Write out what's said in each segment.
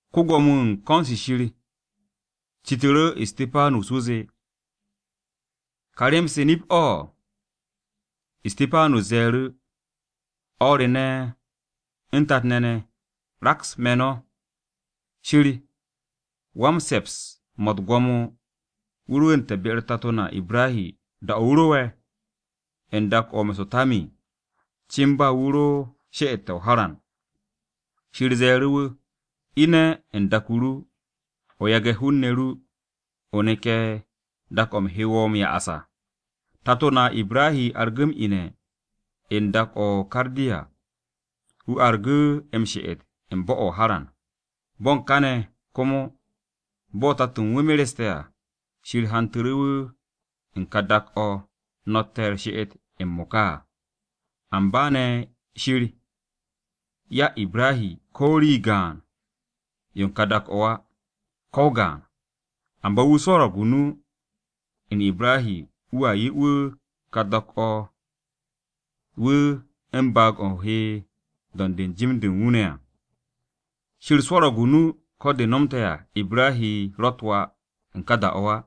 Ko-Gwo̱mo-wu̱ u̱n ko̱n-se Shir citu̱ru̱ Istipanus wu̱ zee, “¿Ka rem-se, nip-o̱?” Istipanus ze̱e̱ru̱, “No̱ o̱r re ne̱ u̱n tat-ne̱ ne̱, raks me̱ no̱. Shir wan-se̱ps-mo̱ u̱t-gwo̱mo wu̱ rwu̱u̱nte̱ be-u̱r tato na Ibrahi da-o̱ wu̱ ro'e̱ u̱n dak-o̱ o-Me̱so̱po̱tami à, cin ba wu̱ ro she'ette̱ bo̱-o̱ o-Haran. Shir ze̱e̱ru̱ wu̱, ‘Ine̱ u̱n dak-o ru, o yage̱ hen-ne̱ ru ne̱, o neke̱ dak-o̱ u̱m he wo̱ m-ya'as à.’ “Tato na Ibrahi argu̱ m-ine̱ u̱n dak-o̱ o-Kardiya, wu̱ argu̱ m-she'et u̱n bo̱-o̱ o-Haran. Bo̱n kane̱ komo, bo̱ tato̱ u̱n wu̱ mereste̱ à, Shir hantu̱ru̱ wu̱ u̱n ka dak-o̱ no̱tte̱ u̱r-she'et m-mo̱ka à. Amba ne̱ Shir 'ya Ibrahi ko̱ rii gaan-yo u̱n ka dak-o̱ á, ko̱ o-gaan. Amba wu̱ swo̱ro̱g o-nu u̱n Ibrahi wu̱a 'ye wu̱ ka dak-o̱ wu̱ u̱n baag-o̱ he m-do̱nd u̱n jim-de u̱n wu̱ ne̱ à. Shir swo̱ro̱g o-nu ko̱ de nomte̱ à Ibrahi rott wà u̱n ka da-o̱ á.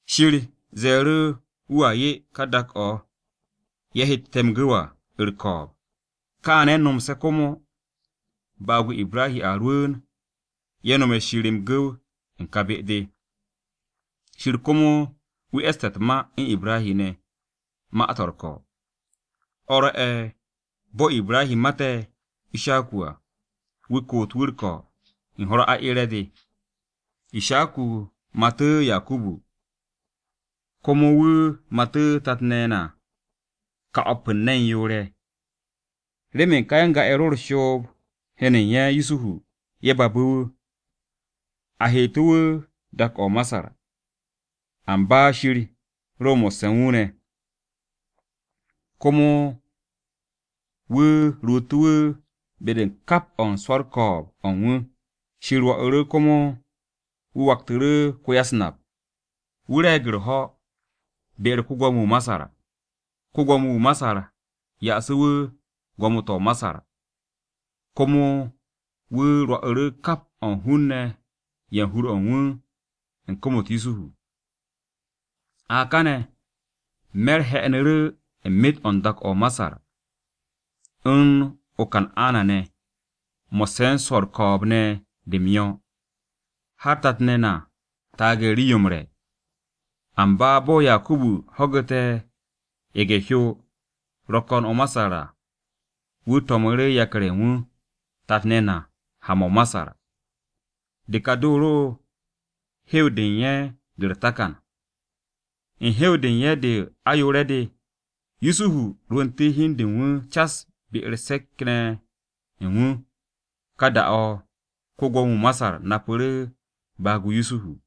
Shir ze̱e̱ru̱ wu̱a 'ye ka dak-o̱ ye̱ hette̱ m-gu̱w à u̱r-ko̱o̱b, kaane̱ nomse̱ komo baag-o Ibrahi a rwu̱u̱n ye̱ nome̱ Shir m-gu̱w u̱n kà be-de. Shir komo wu̱ e̱sste̱ u̱t-ma u̱n Ibrahi ne̱, ma-to̱ u̱r-ko̱. O̱ rwo̱'e̱ bo̱ Ibrahi mate̱ Ishaku à, wu̱ koot wu̱ u̱r-ko̱ u̱n ho̱-u̱r aeere̱-de. Ishaku matu̱ Yakubu, komo wu̱ matu̱ tat-ne̱ na ka o̱p u̱n ne̱n yoor-ye̱. “Remen ka ya-n-ga-ye̱ ro u̱n shoob-u̱r heno u̱n ye̱ Yusuhu, ye̱ babu̱ wu̱. A heetu̱ wu̱ dak-o̱ o-Masar. Amba Shir ro mo̱sse̱ u̱n wu̱ ne̱. Komo wu̱ ruutu̱ wu̱ be-de u̱n kap o̱ u̱n swo̱ u̱r-ko̱o̱b o̱ u̱n wu̱. Shir rwo̱'u̱ru̱ komo wu̱ waktu̱ru̱ ko-ya-u̱s-nap. Wu̱ re̱e̱g u̱r-ho̱ be-u̱r ko-Gwo̱mo-wu̱ o-Masar. Ko-Gwo̱mo-wu̱ o-Masar ya'asu̱ wu̱ gwo̱mo-to̱ o-Masar. Komo wu̱ rwo̱'u̱ru̱ kap o̱ u̱n hun-ne̱ ye̱ u̱n hur-o̱ u̱n wu̱ u̱n kom-u̱t Yusuhu. “A kane̱ me̱r he̱'e̱nu̱ru̱ u̱n myet o̱ u̱n dak-o̱ o-Masar u̱n o-Kan'ana-ne̱, mo̱sse̱ u̱n swo̱ u̱r-ko̱o̱b ne̱ de m-yo̱, har tat-ne̱ na taage̱ u̱n rii-yo m-re̱. Amba bo̱ Yakubu ho̱gu̱te̱ ye̱ge̱-hyo ro̱ ko̱n o-Masar à, wu̱ to̱mu̱ru̱ yakar-ye̱ u̱n wu̱, tat-ne̱ na ha-mo̱ o-Masar. De ka de ro hew-de u̱n ye̱ de u̱r-takan. U̱n hew-de u̱n ye̱ de o ayoore̱-de, Yusuhu rwu̱ntu̱ hi u̱n de u̱n wu̱ cas be-u̱r se̱k-ye̱ ne̱ ye̱ u̱n wu̱ ne̱, ka da-o̱ ko-Gwo̱mo-wu̱ o-Masar napu̱ru̱ baag-o Yusuhu.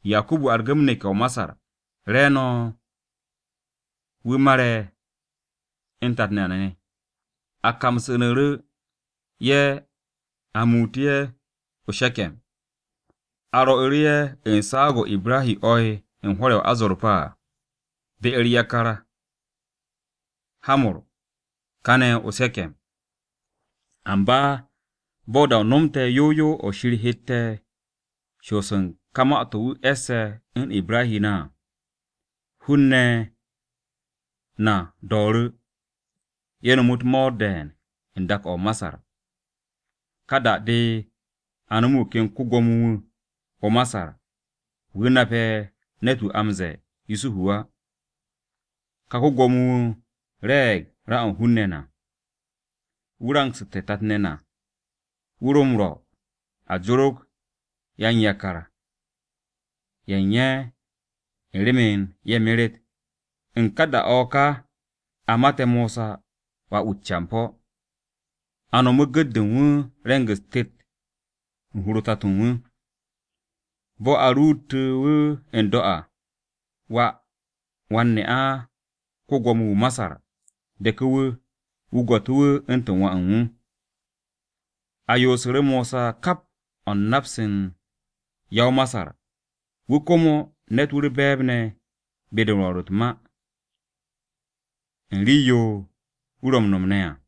Yakubu argu̱ m-neke̱ o-Masar, re̱e̱no̱ wu̱ mare̱ u̱n tat na ne̱. A kamsu̱nu̱ ye̱ a muutu̱ ye̱ o-She̱ke̱m, a rwo̱'u̱ru̱ ye̱ u̱n saag-o̱ Ibrahi o̱'e̱ u̱n hwo̱r-ye̱ o-azorpa à, be-u̱r yakar Hamor kane̱ o-She̱ke̱m. “Amba bo̱ da-o nomte̱ yow yow o̱ Shir hette̱ shoos u̱n ka ma-to̱ wu̱ e̱sse̱ u̱n Ibrahi ne̱ à, hun-ne̱ na do̱o̱ru̱. Ye̱ no̱mu̱ u̱t-mo̱o̱r de̱e̱n u̱n dak-o̱ o-Masar. Ka da-de a no̱mu̱ wu̱ ken ko-Gwo̱mo-wu̱ o-Masar, wu̱ nape̱ ne̱t-wu̱ a m-ze̱e̱ Yusuhu á. Ka ko-Gwo̱mo-wu̱ re̱e̱g ra-o̱ u̱n hun-ne̱ na. Wu̱ rangsu̱te̱ tat-ne̱ na. Wu̱ ro m-rwo̱ a jorog yan-yakar-ye̱ u̱n ye̱ u̱n remen ye̱ meret. “U̱n ka da-o̱ o̱ ka, a mate̱ Mosa, wà-wu̱ u̱t-campo̱. A no̱mu̱ gu̱t-de u̱n wu̱ re̱ng-u̱s tet u̱n hur-o tato u̱n wu̱. Bo̱ a ruutu̱ wu̱ n-do̱ à, wà wan-ne'a ko-Gwo̱mo-wu̱ o-Masar deku̱ wu̱, wu̱ gwo̱tu̱ wu̱ u̱ntu̱n wà u̱n wu̱. A yoosu̱ru̱ Mosa kap o̱ u̱n nap-se u̱n ya-o-Masar. Wu̱ komo ne̱t-wu̱ u̱r-be̱e̱b ne̱ be-de rwo̱r u̱t-ma, u̱n rii-yo wu̱ ro m-no̱m ne̱ à.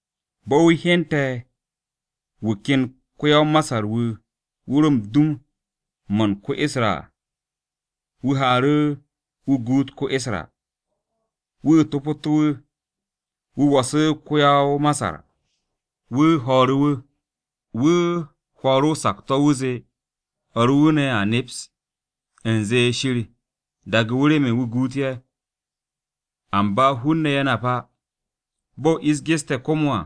Bo̱ wu̱ hyente̱ wu̱ ken ko-ya-o-Masar-wu̱, wu̱ ro u̱n dum-mo̱ u̱n ko-Isra à, wu̱ haaru̱, wu̱ guut ko-Isra, wu̱ topotu̱ wu̱, wu̱ wo̱su̱ ko-ya-o-Masar. Wu̱ ho̱o̱ru̱ wu̱. Wu̱ hwo̱o̱ru̱ o-sakto̱ wu̱ zee o̱r u̱n wu̱ ne̱ a neps u̱nze Shir daage̱ wu̱ remen wu̱ guut ye̱. Amba hun-ne̱ ye̱ nap á. Bo̱ ish geste̱ komo à,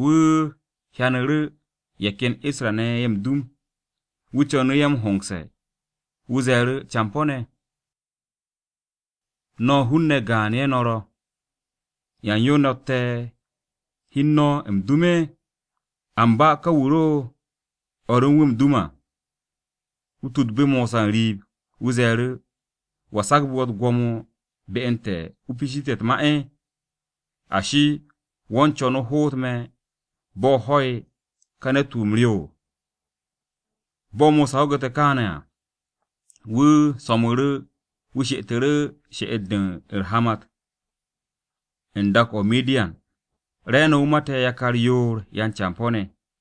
wu̱ hyanu̱ru̱ ye̱ ken Isra-ne̱ ye̱ m-dum, wu̱ co̱nu̱ ye̱ m-hongse̱. Wu̱ ze̱e̱ru̱, ‘Campo̱-ne̱, no̱ hun-ne̱ gaan-ye̱ no̱ ro̱, ¿yan yo no̱tte̱ hi u̱n no̱ m-dum?’ “Amba ka wu̱ ro o̱r u̱n wu̱ m-dum à, wu̱ tudbu̱ Mosa n-riib, wu̱ ze̱e̱ru̱, ‘¿Wa sagbu̱ wo̱ u̱t-gwo̱mo be u̱n te̱ o piishitu̱ te̱ u̱t-ma? Ashi, ¿wo̱ u̱n co̱n o hoot me̱ bo̱ o ho̱'e̱ ka ne̱t-wu̱ wu̱ m-ryo?’ Bo̱ Mosa ho̱gu̱te̱ kaane̱ à, wu̱ so̱mu̱ru̱ wu̱ she'etu̱ru̱ she'et-de u̱r-hamat u̱n dak-o o-Midiyan. Re̱e̱no̱ wu̱ mate̱ yakar yoor yan-campo̱-ne̱.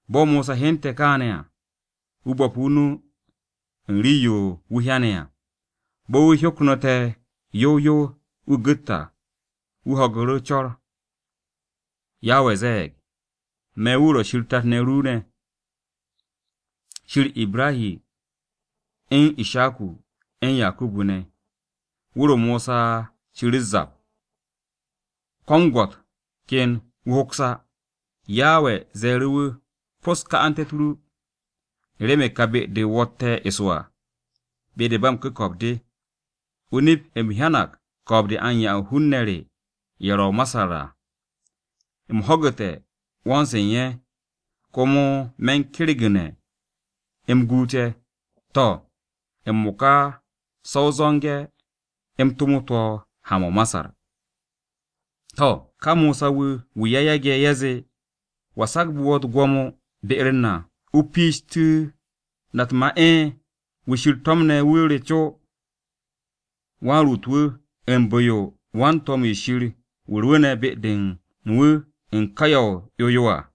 Bo̱ Mosa hyente̱ kaane̱ à, wu̱ bo̱pu̱ o-nu u̱n rii-yo wu̱ hyane̱ à. Bo̱ wu̱ hyoknu̱te̱ yow yow wu̱ gu̱t à, wu̱ ho̱gu̱ru̱ co̱r. Yawe ze̱e̱g, ‘Me̱ wu̱ ro̱ Shir tat-ne̱ ru ne̱, Shir Ibrahi u̱n Ishaku, u̱n Yakubu ne̱.’ Wu̱r-o Mosa ciru̱ u̱s-zap, ko̱ m-gwo̱t ken wu̱ hoks á. “Yawe ze̱e̱ru̱ wu̱, ‘Pos ka'ante̱-u̱t ru, u̱n remen ka be-de wo̱tte̱ eso à, be-de ba m-ku̱ko̱p de. O-nip, u̱m hyanag ko̱o̱b-de a u̱n 'ya u̱n hun-ne̱ re ye̱ ro̱ o-Masar à. U̱m ho̱gu̱te̱ 'wo̱n-se u̱n ye̱, komo me̱ u̱n kergu̱ne̱ u̱m guut ye̱. To̱, m-mo̱ka se̱ o zo̱nge̱ u̱m tomot wo̱ ha-mo̱ o-Masar.’ “To̱, ka Mosa-wu̱, wu̱ ye̱ yage̱, ye̱ zee, ‘¿Wa sagbu̱ wo̱ u̱t-gwo̱mo be-u̱r na o piishitu̱ na u̱t-ma?’ Wu̱ Shir to̱mne̱ wu̱ re co, wan-ruut-wu̱, u̱n bu̱-yo u̱n wan-to̱m-wu̱ Shir wu̱ rwu̱u̱ne̱ be-de u̱n wu̱ u̱n ka ya o-'yo yo à.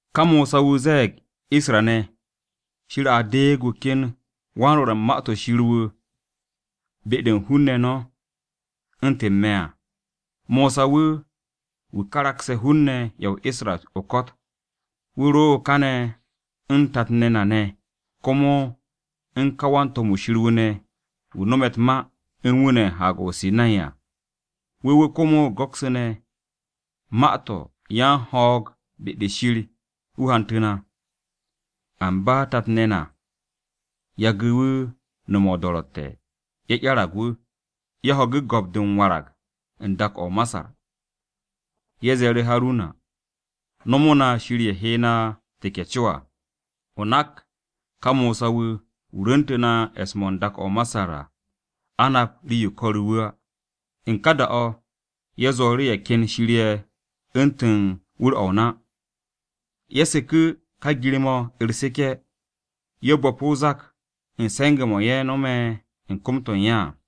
“Ka Mosa-wu̱, wu̱ ze̱e̱ Isra-ne̱, ‘Shir a deeg wu̱ ken wan-rwo̱r u̱n Ma-to̱ Shir wu̱ be-de u̱n hun-ne̱ no̱, u̱ntu̱n me̱.’ Mosa wu̱, wu̱ karakse̱ hun-ne̱ ye̱ o-Isra o-ko̱t. Wu̱ ro káne̱ u̱n tat-ne̱ na ne̱ komo u̱n ka wan-to̱m-wu̱ Shir wu̱ ne̱ wu̱ no̱me̱ u̱t-ma u̱n wu̱ ne̱ u̱n Haag-o o-Sinay à. Wu̱ wu̱ komo go̱ksu̱ne̱ ma-to̱ yan-ho̱o̱g be-de Shir wu̱ hantu̱ na. “Amba tat-ne̱ na yagu̱ wu̱ nome̱ o-do̱ro̱tte̱, ye̱ 'yarag wu̱. Ye̱ ho̱gu̱ go̱p-de m-warag u̱n dak-o̱ o-Masar. Ye̱ ze̱e̱ru̱ Haruna, ‘Nomo na shir-ye̱ he na teke̱ co à. O nak ka Mosa-wu̱, wu̱ rwu̱ntu̱ na e̱s-mo̱ u̱n dak-o̱ o-Masar à, a nap rii-yo ko̱ru̱ wu̱ á.’ U̱n ka da-o̱, ye̱ zwo̱ru̱ ye̱ ken shir-ye̱ u̱ntu̱n wu̱r-o̱ o-na. Ye̱ seku̱ ka gir-mo̱ u̱r-seke̱, ye̱ bo̱pu̱ o-zak u̱n se̱nge̱-mo̱ ye̱ no̱me̱ u̱n kom-to̱ u̱n ye̱ à.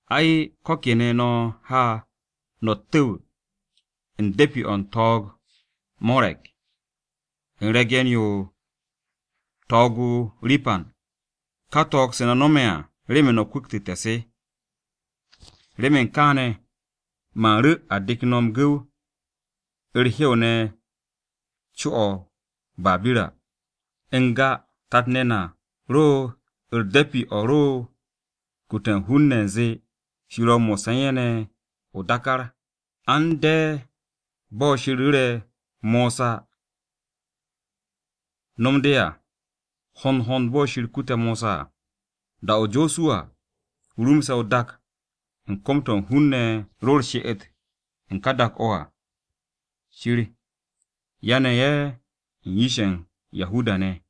Ay, ko̱ kene̱ no̱ ha no̱ u̱t-tu̱w u̱n de̱pi-o̱ u̱n to̱o̱g-o Morek, u̱n re̱ge̱n-yo to̱o̱g-o Ripan, ka to̱o̱g-se no̱ no̱me̱ à remen no̱ kwu̱ktu̱té̱ se. Remen kaane̱, man ru̱ a de̱k no̱ m-gu̱w u̱r-hew ne̱ co-o̱ o-Babira.’ “N-ga, tat-ne̱ na ro u̱r-de̱pi de ro u̱n kute̱ u̱n hun-ne̱ u̱nze Shir ro̱ mo̱sse̱ u̱n ye̱ ne̱ o-dákár à. A u̱n no̱m de bo̱ Shir ru̱re̱ Mosa wu̱ no̱m de à, hond hond bo̱ Shir kute̱ Mosa à. Da-o̱ Josuwa rumse̱ o-dak u̱n kom-to̱ ka hun-ne̱ ro u̱r-she'et u̱n ka dak-o̱ à, Shir yane̱ ye̱ u̱n yish-ye̱ u̱n Yahuda-ne̱.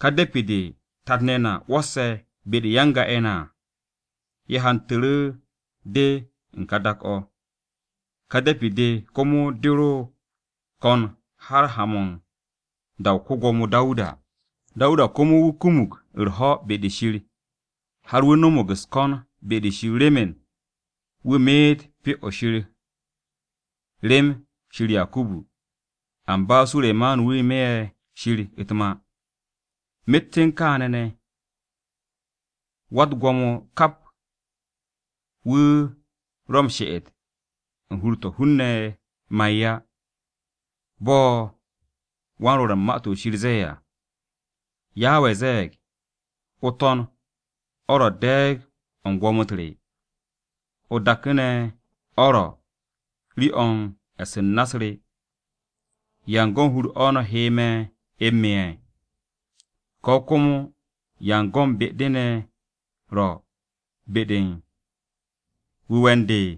Ka de̱pi-de tat-ne̱ na 'wo̱o̱se̱ be-de u̱n ya-n-ga-ye̱ na à, ye̱ hantu̱ru̱ de u̱n ka dak-o̱. Ka de̱pi-de komo de ro ko̱n har haan-mo̱ u̱n da-o ko-Gwo̱mo Dawuda. Dawuda komo wu̱ kumug u̱r-ho̱ be-de Shir, har wu̱ no̱mo̱g u̱s-ko̱n be-de Shir remen wu̱ meet Pyo-o̱ Shir rem Shir Yakubu. Amba Suremanu wu̱ me'e̱ Shir u̱t-ma. “Myet u̱n kaane̱ ne̱, Wa-u̱t-Gwo̱mo kap wu̱ ro̱ m-she'et u̱n hur-to̱ hun-ne̱ ma'e̱ á. Bo̱ wan-Rwo̱r u̱n Ma-to̱ Shir ze̱e̱ à, “ ‘Yawe ze̱e̱g, “O-To̱n o̱ ro̱ de̱e̱g-o̱ u̱n gwo̱mo-u̱t re, o-dak ne̱ o̱ ro̱ rii-o̱ u̱n e̱s u̱n na-u̱s re. ¿Yan go̱n hur-o̱ no̱ he me̱ m-me'e̱? Ko̱ komo ¿yan go̱n be-de ne̱ ro̱ be-de u̱n wu̱we̱ u̱n de?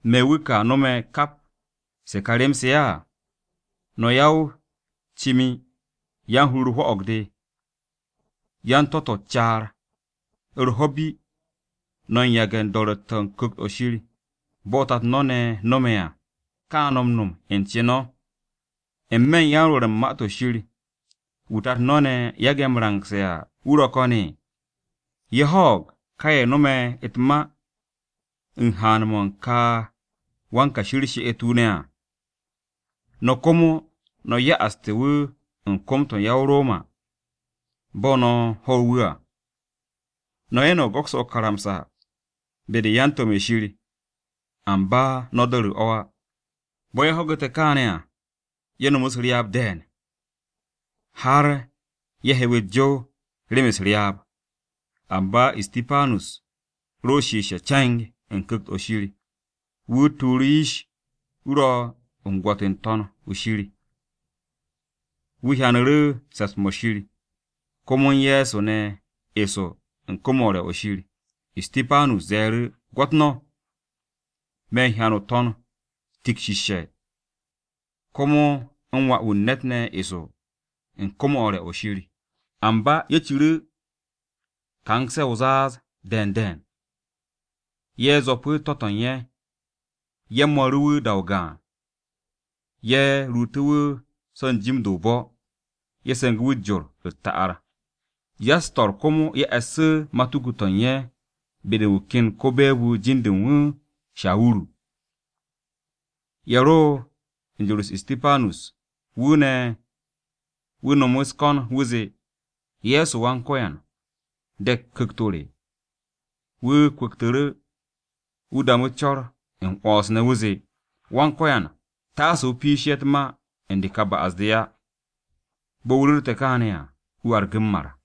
¿Me̱ wu̱ ka no̱me̱ kap se ká rem-se á?” ’ “No̱ ya-o-cimi, yan-hur-u̱r hwo̱'o̱g-de, yan-to̱-to̱ u̱n caar. U̱r-ho̱ bi, no̱ u̱n yage̱ o-do̱ro̱tte̱ u̱n Ku̱kt-o̱ Shir, bo̱ tato no̱ ne̱ no̱me̱ à, ka no̱ m-no̱m u̱n ce no̱. ¿N-me̱ u̱n yan-rwo̱r u̱n Ma-to̱ Shir, wu̱ tato no̱ ne̱ yage̱ m-rangse̱ à, wu̱ ro̱ ko̱n? Ye̱ ho̱o̱g ka ye̱ no̱me̱ u̱t-ma u̱n haan-mo̱ u̱n ka wan-Kashi u̱r-she'et wu̱ ne̱ à. No̱ komo, no̱ ya'aste̱ wu̱ u̱n kom-to̱ u̱n ya-o-Roma, bo̱ no̱ ho̱ wu̱ à. No̱ ye̱ ne̱ go̱kse̱ o-karamsa be-de u̱n yan-to̱m-ye̱ Shir, amba no̱ do̱ru̱ o̱ á.” Bo̱ ye̱ ho̱gu̱te̱ kaane̱ à, ye̱ no̱mu̱ u̱s-ryaab de̱e̱n har ye̱ hew u̱s-jow remen u̱s-ryaab. Amba Istipanus ro shiishe̱ ce̱ng u̱n Ku̱kt-o̱ Shir. Wu̱ tuuru̱ yish, wu̱ ro u̱n gwo̱t o-To̱n shir, wu̱ hyanu̱ru̱ se̱ps-mo̱ Shir, komo u̱n Ye̱so ne̱ eso u̱n kom-o̱ u̱r-re̱ o̱ Shir. Istipanus ze̱e̱ru̱, “Gwo̱t no̱, me̱ u̱n hyan o-To̱n tikshishe̱, komo u̱n Wà-wu̱ u̱n ne̱t ne̱ eso u̱n kom-o̱ u̱r-re̱ o̱ Shir.” Amba ye̱ ciru̱ kan-se o-zaaz de̱e̱n de̱e̱n, ye̱ zwo̱pu̱ to̱-to̱ u̱n ye̱, ye̱ mo̱ru̱ wu̱ da-o gaan. Ye̱ ruutu̱ wu̱ so̱ n-jim de o-bo̱. Ye̱ se̱ngu̱ wu̱ u̱s-jor u̱t-ta'ar. Ya-u̱s-to̱r komo ye̱ e̱ssu̱ matuku-to̱ u̱n ye̱ be-de u̱n wu̱ ken ko-be̱e̱b-wu̱, jin-de u̱n wu̱ Shawuru. Ye̱ ro u̱n jor-u̱s Istipanus, wu̱ ne̱, wu̱ no̱mu̱ u̱s-ko̱n wu̱ zee, “Ye̱so Wan-Ko̱yan, de̱k ku̱kt-o re.” Wu̱ kwu̱ktu̱ru̱, wu̱ damu̱ co̱r m-'wo̱ns ne̱ wu̱ zee, “Wan-Ko̱yan, taase o piishe̱ ye̱ u̱t-ma u̱n de ka ba'as-de á.” Bo̱ wu̱ ru̱rte̱ kaane̱ à, wu̱ argu̱ m-mar.